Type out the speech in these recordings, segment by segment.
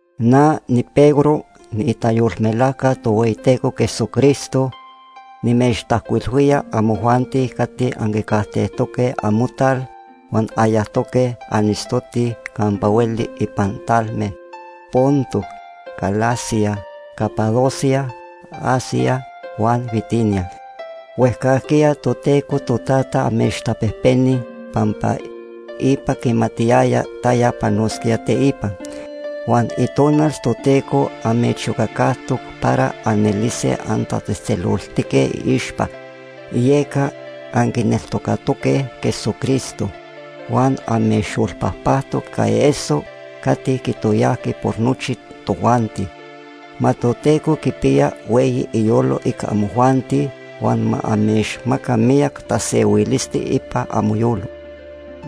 Na niPedro niitayolmelajca Tohueyiteco Jesucristo. Nimechtajcuilhuía amojuanti cati anquicajtejtoque amotal huan anyajtoque anitztotij campa hueli ipan talme Ponto, Galacia, Capadocia, Asia huan Bitinia. Huejcajquiya Toteco Totata amechtapejpeni pampa ipa quimatiyaya taya panosquía teipa. Huan Itonal Toteco amechiyocacajtoc para anelise antatzejtzeloltique iixpa. Yeca anquineltocatoque Jesucristo huan amechyolpajpactoc ica ieso cati quitoyajqui por nochi tojuanti. Ma Toteco quipiya hueyi iyolo ica amojuanti huan ma amechmaca miyac tasehuilisti ipan amoyolo.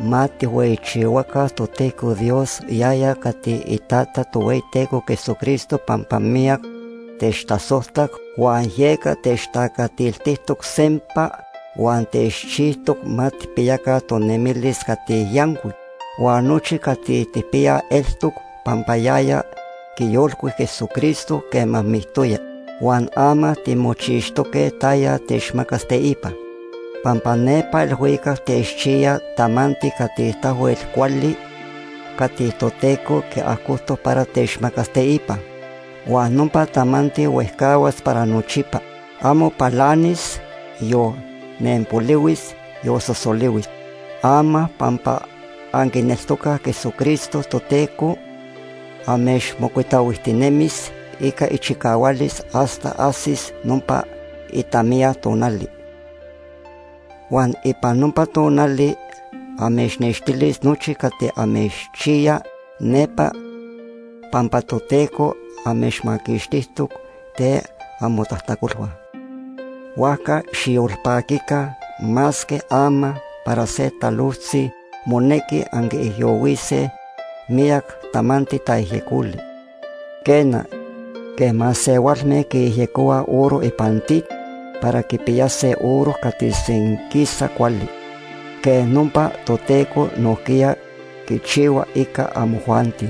Ma tijhueyichihuaca Toteco Dios yaya cati iTata Tohueyiteco Jesucristo pampa miyac techtasojta, huan yeca techtacatiltijtoc sempa huan techchijtoc ma tijpiyaca tonemilis cati yancuic. Huan nochi cati tijpiyaj eltoc pampa yaya quiyolcuic Jesucristo quema mictoya. Huan ama timochixtoque taya techmacas teipa, pampa nepa ilhuicac techchiya tamanti cati tahuel cuali cati Toteco quiajoctoc para techmacas teipa. Huan nopa tamanti huejcahuas para nochipa. Amo palanis, yon nenpolihuis, yon sosolihuis. Ama pampa anquineltocaj Jesucristo, Toteco amechmocuitahuijtinemis ica ichicahualis hasta ajsis nopa itamiya tonali. Huan ipan nopa tonali amechnextilis nochi cati amechchiya nepa pampa Toteco amechmaquixtijtoc ten amotajtacolhua. Huajca xiyolpaquica, masque ama para se talojtzi monequi anquiijyohuise miyac tamanti tayejyecoli. Quena, quej masehualme quiyejyecohuaj oro ipan tit para quipiyase oro cati senquisa cuali, quej nopa Toteco nojquiya quichihua ica amojuanti.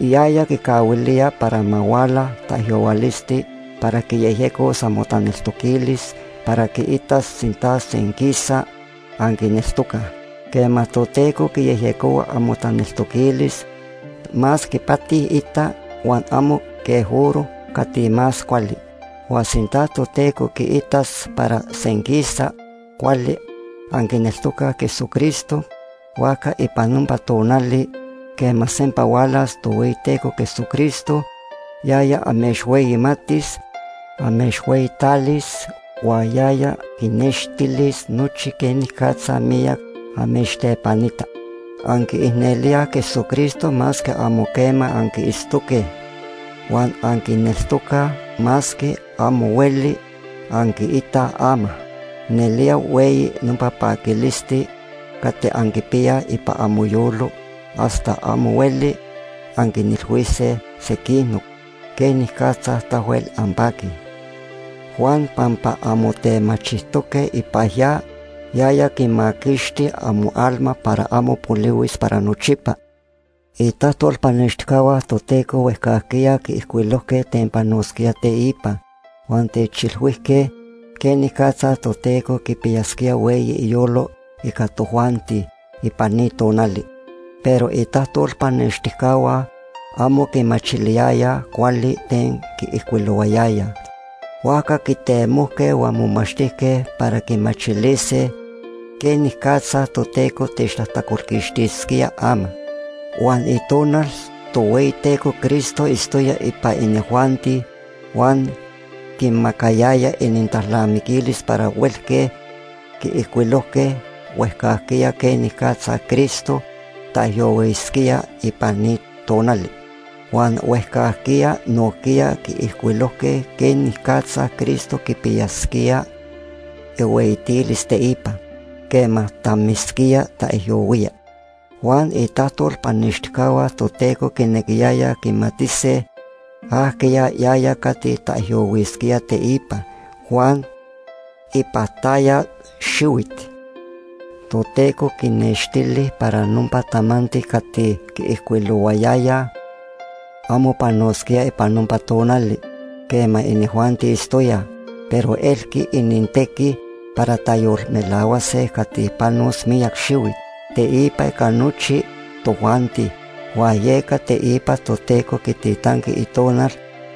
Yaya quicahuilía para ma huala taijyohuilisti para quiyejyecos amotaneltoquilis para quiitas sinta senquisa anquineltocaj. Quema Toteco quiyejyecohua amotaneltoquilis, más quipatiita huan amo quej oro cati más cuali. Huan sinta Toteco quiitas para senquisa cuali anquineltocaj Jesucristo, huajca ipan nopa tonali quema sempa hualas Tohueyiteco Jesucristo yaya amechhueyimatis, amechhueyitalis huan yaya quinnextilis nochi quenicatza miyac amechtepanita. Anquiicnelíaj Jesucristo masque amo quema anquiitztoque. Huan anquineltocaj masque amo hueli anquiitaj ama. Nelía hueyi nopa paquilisti cati anquipiyaj ipan amoyolo hasta amo hueli anquinilhuise sequinoc quenicatza tahuel anpaquij. Huan pampa anmotemachijtoque ipan ya, yaya quimaquixti amoalma para amo polihuis para nochipa. Itajtolpanextijcahua Toteco huejcajquiya quiijcuilojque ten panosquía teipa huan techilhuijque quenicatza Toteco quipiyasquía hueyi iyolo ica tojuanti ipan ni tonali. Pero itajtolpanextijcahua amo quimachiliyayaj cuali ten quiijcuilohuayayaj. Huajca quitemojque huan momachtijque para quimachilise quenicatza Toteco techtajtacolquixtisquía ama. Huan Itonal Tohueyiteco Cristo itztoya ipan inijuanti, huan quinmacayaya inintalnamiquilis para huelque quiijcuilojque huejcajquiya quenicatza Cristo taijyohuisquía ipan ni tonali. Huan huejcajquiya nojquiya quiijcuilojque quenicatza Cristo quipiyasquía ihueyitilis teipa, quema tamisquía taijyohuía. Huan itajtolpanextijcahua Toteco quinequiyayaj quimatise ajquiya yaya cati taijyohuisquía teipa huan ipan taya xihuit. Toteco quinnextili para nopa tamanti cati quiijcuilohuayayaj amo panosquía ipan nopa tonali quema inijuanti itztoyaj, pero elqui inintequi para tayolmelahuase cati panos miyac xihuit teipa ica nochi tojuanti. Huan yeca teipa Toteco quititanqui Itonal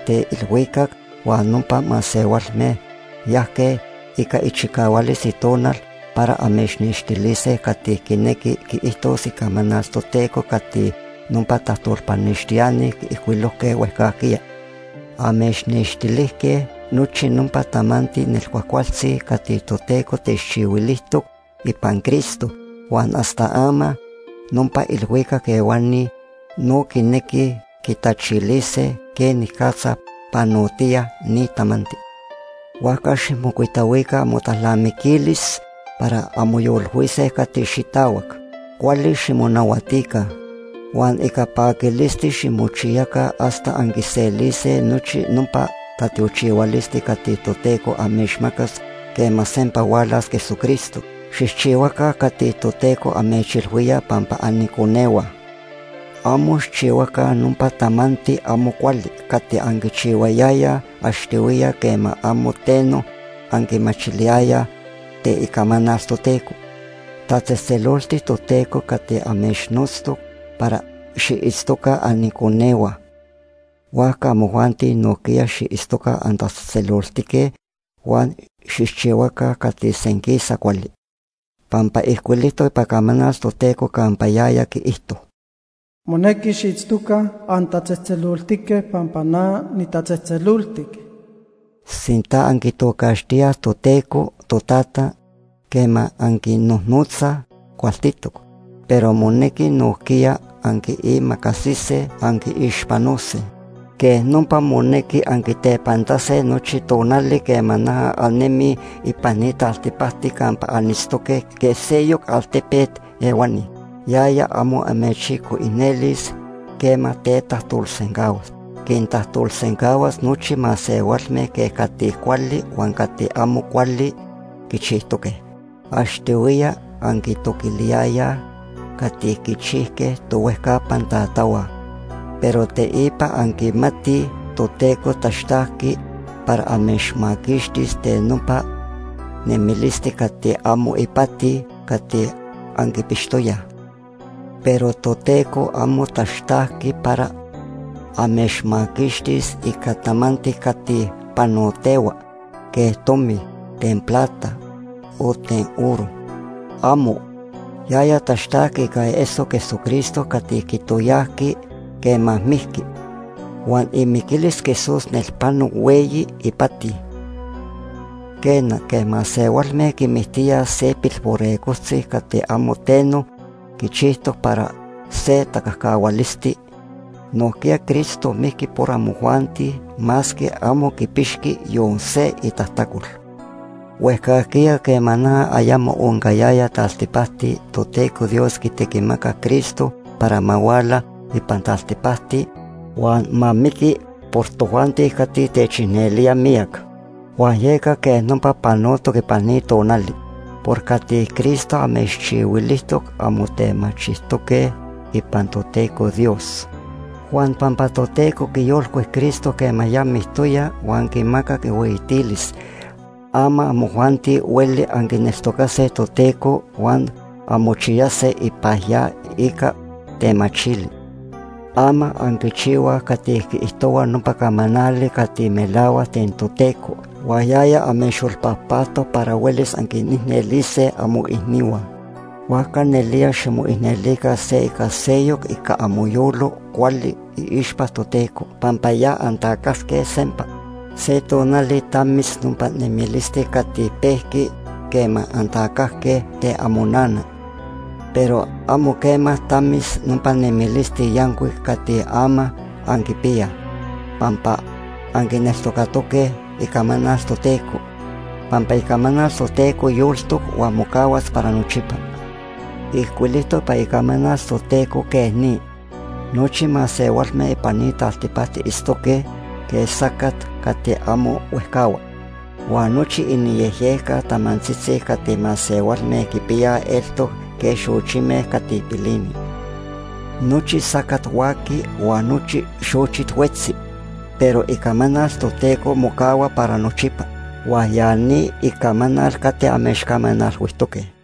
ten ilhuicac, huan nopa masehualme yajque ica ichicahualis Itonal para amechnextilise cati quinequi quiijtos Icamanal Toteco cati nopa tajtolpanextiani quiijcuilojque huejcajquiya. Amechnextilijque nochi nopa tamanti nelcuajcualtzi cati Toteco techchihuilijtoc ipan Cristo huan hasta ama nopa ilhuicac ehuani no quinequij quitachilise quenicatza panotiya ni tamanti. Huajca xijmocuitahuica amotalnamiquilis para anmoyolilhuise cati xitahuac. Cuali ximonahuatica. Huan ica paquilisti ximochiyaca hasta anquiselise nochi nopa tatiochihualisti cati Toteco amechmacas quema sempa hualas Jesucristo. Xijchihuaca cati Toteco amechilhuía pampa aniconehua. Amo xijchihuaca nopa tamanti amo cuali cati anquichihuayayaj achtohuiya quema amo teno anquimachiliyayaj ten icamanal Toteco. Tatzejtzeloltic Toteco cati amechnotztoc para xiitztoca aniconehua; huajca amojuanti nojquiya xiitztoca antatzejtzeloltique huan xijchihuaca cati senquisa cuali. Pampa ijcuilijtoc ipan Icamanal Toteco campa yaya quiijto: “Monequi xiitztoca antatzejtzeloltique pampa na nitatzejtzeloltic.” Sinta anquitocaxtíaj Toteco “Totata” quema anquinojnotzaj, cualtitoc, pero monequi nojquiya anquiimacasise anquiixpanose. Quej nopa monequi anquitepanitase nochi tonali quema noja annemij ipan ni taltipacti campa anitztoque quej seyoc altepet ehuani. Yaya amo amechchicoicnelis quema tetajtolsencahuas. Quintajtolsencahuas nochi masehualme quej cati cuali huan cati amo cuali quichijtoque. Achtohuiya anquitoquiliyayaj cati quichijque tohuejcapan tatahua, pero teipa anquimatij Toteco taxtajqui para amechmaquixtis ten nopa nemilisti cati amo ipati cati anquipixtoyaj. Pero Toteco amo taxtajqui para amechmaquixtis ica tamanti cati panotehua quej tomi ten plata o ten oro. ¡Amo! Yaya taxtajqui ica ieso Jesucristo cati quitoyajqui quema mijqui. Huan imiquilis Jesús nelpano hueyi ipati. Quena, quej masehualme quimictíaj se pilborregojtzi cati amo teno quichijtoc para se tacajcahualisti, nojquiya Cristo mijqui por amojuanti masque amo quipixqui yon se itajtacol. Huejcajquiya quema noja ayemo oncayaya taltipacti, Toteco Dios quitequimacac Cristo para ma huala ipan taltipacti huan ma miqui por tojuanti cati techicnelía miyac. Huan yeca quej nopa panotoc ipan ni tonali. Por cati Cristo amechchihuilijtoc, anmotemachijtoque ipan Toteco Dios. Huan pampa Toteco quiyolcuic Cristo quema ya mictoya huan quimacac ihueyitilis, ama amojuanti hueli anquineltocase Toteco huan anmochiyase ipan ya ica temachili. Ama anquichihuaj cati quiijtohua nopa camanali cati melahuac ten Toteco, huan yaya amechyolpajpactoc para huelis anquinicnelise amoicnihua. Huajca nelía ximoicnelica se ica seyoc ica amoyolo cuali iixpa Toteco, pampa ya antacatque sempa. Se tonali tamis nopa nemilisti cati pejqui quema antacatque ten amonana, pero amo quema tamis nopa nemilisti yancuic cati ama anquipiyaj pampa anquineltocatoque Icamanal Toteco, pampa Icamanal Toteco yoltoc huan mocahuas para nochipa. Ijcuilijtoc ipan Icamanal Toteco quej ni: “Nochi masehualme ipan ni taltipacti itztoque quej sacat cati amo huejcahua. Huan nochi iniyejyejca tamantzitzi cati masehualme quipiyaj eltoc quej xochime cati pilinij. Nochi sacat huaqui huan nochi xochit huetzi, pero Icamanal Toteco mocahua para nochipa.” Huan ya ni Icamanal cati amechcamanalhuijtoque.